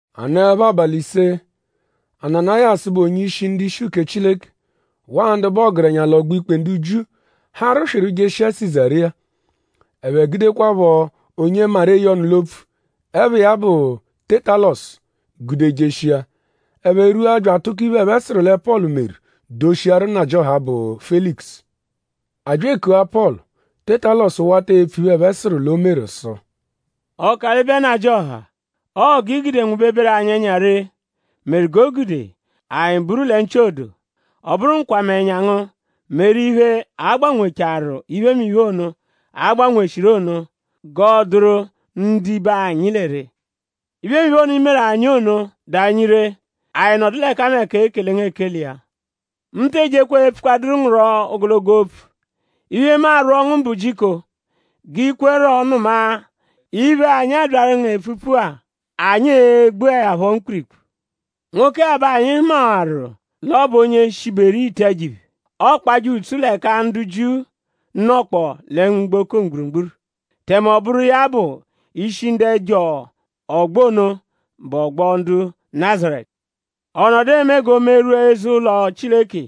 A nọepho abalị ise; Ananayasu, bụ onye-ishi ndu-ishi uke Chileke waa ndu bụ ọgerenya l'ọgbo-ikpe ndu Jiu harụ swịru jeshia Sizariya. Ẹphe gudekwaphọ onye maru eye ọnu l'opfu, ẹpha iya bụ Tẹtalosu gude jeshia. Ẹphe rwua bya atụko iphe, ẹphe sụru lẹ Pọlu meru doshiaru nnajịoha, bụ Felikusu. A bya ekua Pọlu. Tẹtalosu wata epfu iphe, ẹphe sụru l'o meru sụ: “Ọkalibe Nnajịoha; ọo g'i gude nwụbeberu anyi ẹnya ree meru g'o gude anyi buru lẹ nchị odoo. Ọ bụru nkwamẹnya ngu meru iphe, a gbanwechaaru iphemiphe ono, a gbanweshiru ono g'ọoduru ndibe anyi lẹ ree. Iphemiphe ono, iimeru anyi ono dụ anyi ree. Anyi nọdu l'ẹkameka ekele ngu ekele iya. Mu te ejeẹkwa epfukwadụru ngu rọ ogologo opfu. Iphe, mu arwọ ngu bụ jiko g'i kwerọ nụma iphe-a, anyi abyaru ngu epfuru-a. Anyi e-gbuẹ ya phọ mkpirikpu. Nwoke-a bẹ anyi hụmawaru l'ọ bụ onye shiberu ite ẹjo-iphe. Ọokpaje ùtsú l'ẹka ndu Jiu nọkpoo lẹ mgboko mgburugburu. Tẹme ọ bụru iya bụ ishi ndu ẹjo ọgbo ono, bụ ọgbo ndu Nazaretu. Ọ nọdu eme g'o merwua eze-ụlo Chileke.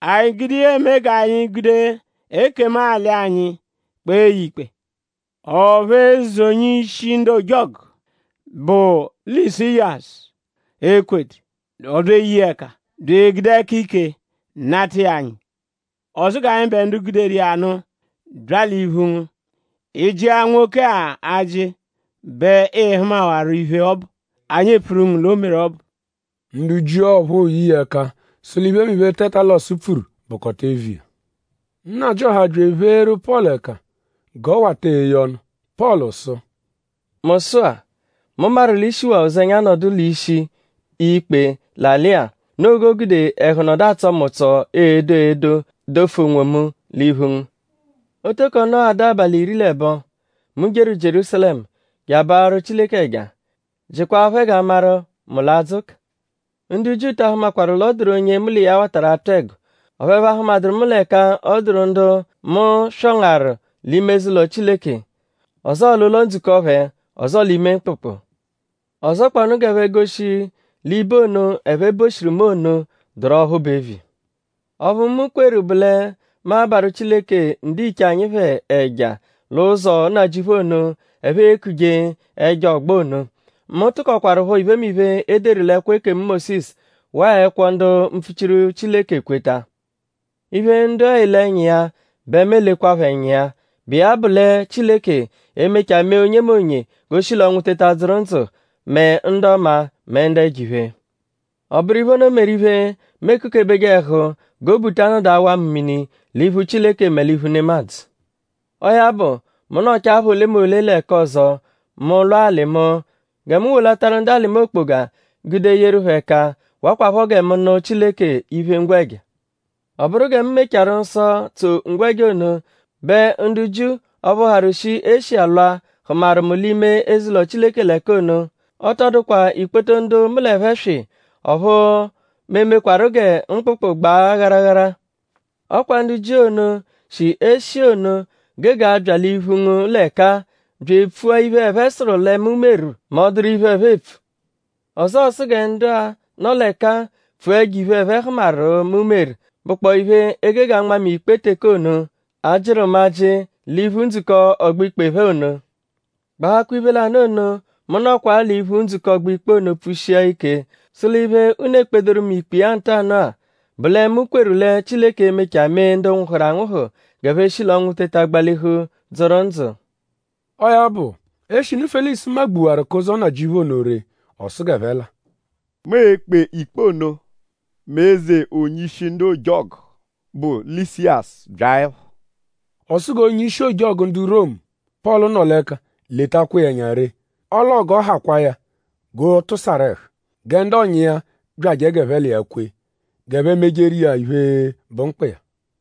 Anyi gude iya eme g'anyi gude ekemu-alị anyi kpee ya ikpe. Ọphu eze onye-ishi ndu ojọgu, bụ Lịsiyasu ekwedu. Ọ bya eye iya ẹka; bya egude ẹka ike nata iya anyi. Ọ sụ g'anyịbe ndu guderu iya nụ bya l'iphu ngu. Ị -jịa nwoke-a ajị bẹ ịi-hụmawaro iphe ọbu, anyi epfuru ngu l'o meru ọbu.” Ndu Jiu ọphuu ye iya ẹka sụ l'iphemiphe, Tẹtalosu pfuru bụkota eviya. Nnajịoha bya epheeru Pọlu ẹka g'ọ wata eye ọnu. Pọlu sụ: “Mu sụ-a; mu maru l'i shiwaa ụzenya nọdu l'ishi ikpe l'alị-a. Noo g'o gude ẹhu nọdu atsọ mu ụtso edo edo dofu onwomu l'iphu ngu. Ọ tọko nọghadu abalị iri l'ẹbo, mu jeru Jierúsalẹmu je abarụ Chileke ẹja. Jịkwaa phẹ g'a maru?mu l'adzụ ụka. Ndu Jiu ta ahụmakwaru l'ọ dụru onye mu l'iya watarụ atụ ẹgo; ọphu ẹphe ahụmaduru mu l'ẹka ọ dụru ndu mu swọngaru l'ime eze-ụlo Chileke; ọzoo l'ụlo-ndzukọ phẹ; ọzoo l'ime mkpụkpu. Ọzokpoonu g'ẹphe goshi l'ibo ono, ẹphe boshiru mu ono dụru ọphu bụ eviya. Ọphu, mu kweru bụ lẹ mu abarụ Chileke ndiche anyi phẹ ẹja lẹ Ụzo Nnajịuphu ono, ẹphe ekuje ẹjo ọgbo ono. Mu tụkokwarupho iphemiphe, e deru l'ẹkwo ekemu Mósisu waa ẹkwo ndu mpfuchiru Chileke kweta. Iphe, ndu-a ele ẹnya iya bẹ mu elekwaphọ ẹnya iya, bụ iya bụ lẹ Chileke e-mechaa mee onyemonye g'o shi l'ọnwu teta dzụru ndzụ mẹ ndu ọma mẹ ndu ẹjo-iphe. Ọ bụru iphe ono meru iphe, mu ekukebeje ẹhu g'obu ta anọdu awa mu mini l'iphu Chileke mẹ l'iphu nemadzụ. “Ọo ya bụ; mu nọchaa apha olemole l'ẹka ọzo; mu lwa alị mu gẹ mu wolataru ndu alị mu okpoga gude yeru phẹ ẹka; wakwaphọ gẹ mu nụ Chileke iphe-ngwẹja. Ọ bụru gẹ mu mechaarụ nsọ, tso ngwẹja ono bẹ ndu Jiu ọphu harụ shi Eshiya lwa hụmaru mu l'ime eze-ụlo Chileke l'ẹka ono. Ọ tọ dụkwa ikpoto ndu mu l'ẹphe swị; ọphu mu emekwaru gẹ mkpụkpu gbaa gharagharaghara. Ọ kwa ndu Jiu ono, shi Eshiya ono gege abya l'iphu ngu l'ẹka-a bya epfua iphe, ẹphe sụru lẹ mu meru mẹ ọ -dụru iphe, ẹphe epfu. Ọzoo sụ gẹ ndu-a, nọ l'ẹka-a pfua ẹjo-iphe ẹphe hụmaru, mu meru, bụkpoo iphe, e gege anma mu ikpe teke ono, a jịru mu ajị l'iphu ndzukọ ọgbo-ikpe phẹ ono; gbahakwa iphe lanụ ono, mu nọkwa-a l'iphu ndzukọ ọgbo-ikpe ono pfushia ike sụ l'iphe, unu ekpedoru mu ikpe iya ntanụ-a bụ lẹ mu kweru lẹ Chileke e-mechaa mee ndu nwụhuru anwụhu g'ẹphe shi l'ọnwu teta gbalihu dzụru ndzụ.” Ọo ya bụ; eshinu Felikusu magbuwaru kẹ Ụzo Nnajịuphu ono ree; ọ sụ g'ẹphe la. “Mu e-kpe ikpe ono mẹ eze onye-ishi ndu ojọgu, bụ Lịsiyasu byaẹpho.” Ọ sụ g'onye-ishi ojọgu ndu Romu, Pọlu nọ l'ẹka letakwa iya ẹnya ree; ọle ọo g'ọ hakwaa ya g'ọ tụsaru ẹhu; gẹ ndu ọ̀nyà iya byajẹ g'ẹphe l'iya kwe; g'ẹphe mejeru iya iphe, bụ mkpa iya.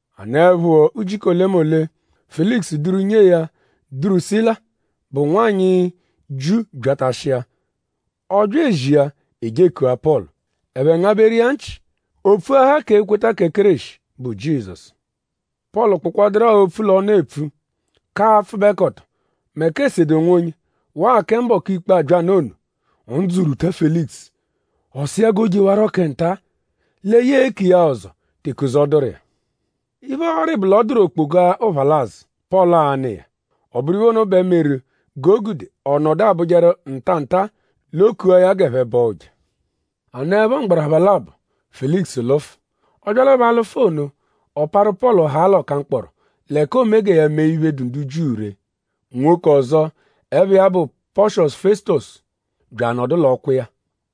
A nọepho ujiku olemole; Felikusu duru nyee ya Durusila, bụ nwanyị Jiu byatashia. Ọ bya ezia; e je ekua Pọlu. Ẹphe ngabẹru iya nchị; o pfuahaa k'ekweta kẹ Kéreshi, bụ Jizọsu. Pọlu kpụkwaduru-a opfu l'ọnu epfu k'apfụbekoto mẹ k'esede onwonye; waa kẹ mbọku ikpe, a-bya nụ ono; ndzụ rwuta Felikusu. Ọ sụ iya g'o jewarọ kẹ nta; lẹ ya e-ku iya-a ọzo teke ụzo dụru iya. Iphe, ọori bụ l'ọ dụru okpoga ụphalazu, Pọlu a-nụ iya. Ọ bụru iphe ono bẹ meru g'o gude ọ nọdu abụjeru nta nta l'o kua ya g'ẹphe bọo ụja. A nọepho mgbarapha labọ; Felikusu lụfu. Ọ byalẹpho alụfu ono; ọ parụ Pọlu haa l'ọka-mkpọro l'ẹka oome gẹ ya mee iphe, dụ ndu Jiu ree. Nwoke ọzo, ẹpha iya bụ Pọshosu Fẹsutosu bya anọdu l'ọkwa iya.